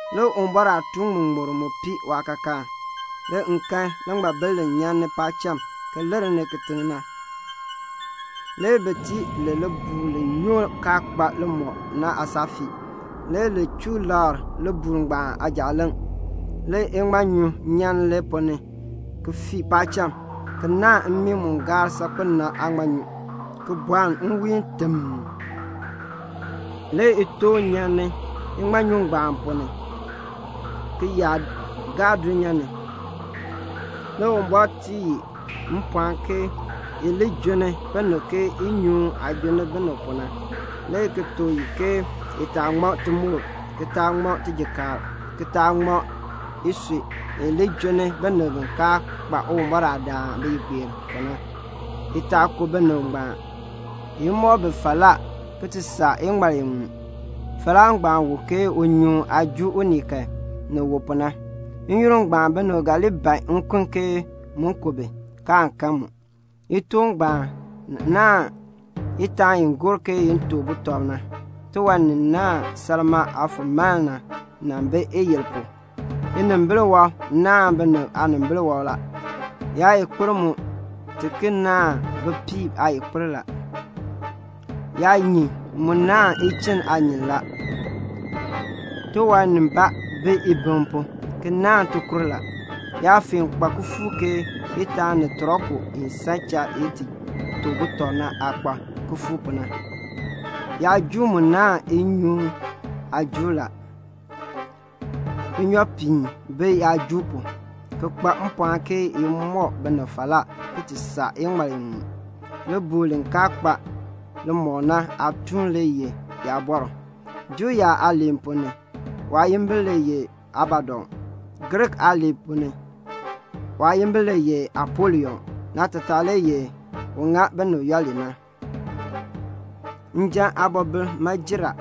Le Uwumbɔr aatuun ŋmuŋmur mu pii waakaakaan. Le m kan liŋmabil li nyan paacham ki lir kitiŋ ni na. Le bi tii li libuul li nyoo kaa kpa limɔk na aasaafii. Le li chuu lakr libuul ngbaan aajaaleŋ. Le iŋmanyu nyan li ponn ni ki fii paacham, ki naahn mmii mu gaar saakpen na aaŋmanyu, ki bɔln nwiin timm. Le itoon nyan iŋmanyu ngbaan ponn ni, ki yaa gaa dulnyaa ni. Le Uwumbɔr tii i mpɔɔn ke i li junni binib ke inyoohn aah junni binib pu na, le ki tuk i ke i taa ŋma timoor, ki taa ŋma tijikaar, ki taa ŋma isui, i li junni binib bi kaa kpa Uwumbɔr aadaan biyigbeer pu na; i taa ku binib ngbaan, i li mɔk bi falaa iŋmal iŋmu. Falaa ngbaan wu ke unyoohn aah juu unii kan, ni wu pu na. N-yoonn ngbaan binib ga li ban nkun ke mu ku bi, kaan kan mu. Itoon ngbaan naahn itaan i gor ke i to butɔb na. Tiwan ni naahn salmaa aafulmaln na nan bi iyil pu. Inimbil wɔb naahn binib aanimbil wɔb la. Yaayikpir mu ti ki naahn bipiib aayikpir la. Yaanyin mu naahn ichinn aanyin la. Tiwan bii ibiŋ pu ki naahn tikur la. Yaafeen kpa kifuuk ke itaan ni tɔriku i san cha i ti to butɔb na aah kpa kifuuk pu na. Yaajuul mu naahn inyoohn aajuul la. Inyoopiin bi yaajuul pu, ki kpa mpɔɔn ke i mɔk binib falaa iŋmal iŋmu. Libuul li kaa kpa limɔk na aatuun le ye yaabɔr. Juu yaab aaliin ponn ni waayimbil le ye Abadon. Griik aaliin ponn ni waayimbil le ye Apolion. Naatataa le ye "Un ŋa binib yooli na." Njan aabɔbil ma jer a.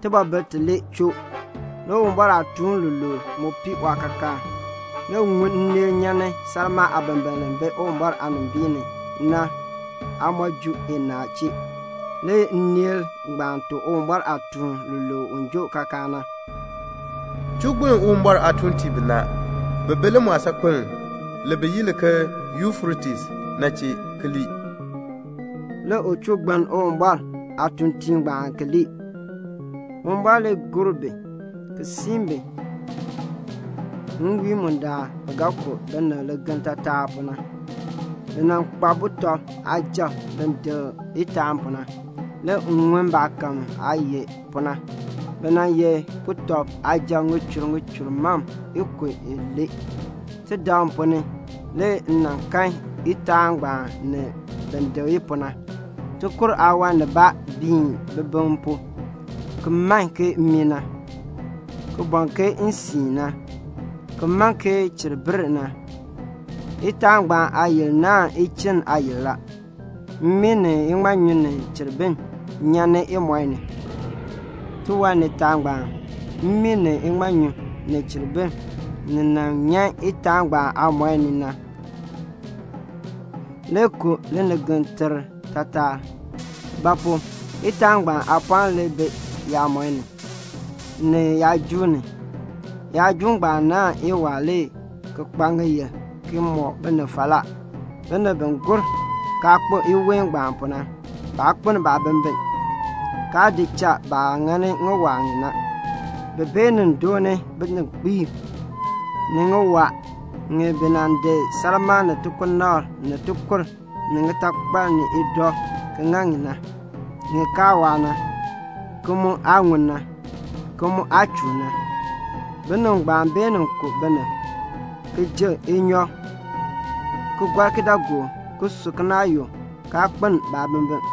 Tibɔbil tilee choo. Le Uwumbɔr aatuun luluub mu pii waakaakaan. Le m ŋun nneel nyan ni salmaa aabimbiln li bi Uwumbɔr aanimbiin ni na aayiin inaa chee. Le nneel ngbaan tuk Uwumbɔr aatuun luluub u joo kaakaan na, "Chuu gbiln Uwumbɔr aatuuntiib binaa bi bi limɔɔl saakpeln bi yi li ke Yufretes na chee, ki lii." Le u chuu gbiln Uwumbɔr aatuuntiib ngbaan ki lii. Uwumbɔr le gor bi ki siin bi nwiin mu bi ga ku binib ligeln taatar pu na. Bi nan kpa sujatiib bi dik itaan pu na. Le m ŋun baakahm aah ye pu na. Bi nan ye sujatiib ŋichur ŋichur mam ikub ilee. Tidaŋ ponn ni le m kan itaan ngbaan ni bin dik i pu na. Tikur aawan biin bibiŋ pu ki man ke mmii na, ki bɔn ke nsiin na, ki man ke cheribir na. Itaan ngbaan aayil naahn ichinn aayil la. Mmii ni iŋmanyu ni cheribir nyan imɔi ni. Tiwan nitaa ngbaan, mmii ni iŋmanyu ni cheribir, ni nyan itaan ngbaan aamɔi ni na, nima le ku linigetekr taatar; ba pu? itaan ngbaan aapɔɔn le bi yaamɔi ni, ni yaajuul ni. Yaajuul ngbaan naahn iwaa ki kpa ŋiyil ki mɔk binib falaa. Binib bi gur kaa kpo iween ngbaan pu na, baa kpeln baabimbin, kaa di cha baah ŋani ŋiwaa ŋi na. Bi beenin dooni bininkpiib, ni ŋiwaa ŋi bi nan di salmaa ni ansilfa ni tikur ni ŋitakpal ni idɔ ki ŋa ŋi na, ŋi kaa waa na, ki mu aa ŋun na, ki mu aa chuun na. Binib ngbaan beenin ku binib, ki ji inyɔk, ki gɔr kidaagook, ki su kinaayuk, kaa kpeln baabimbin.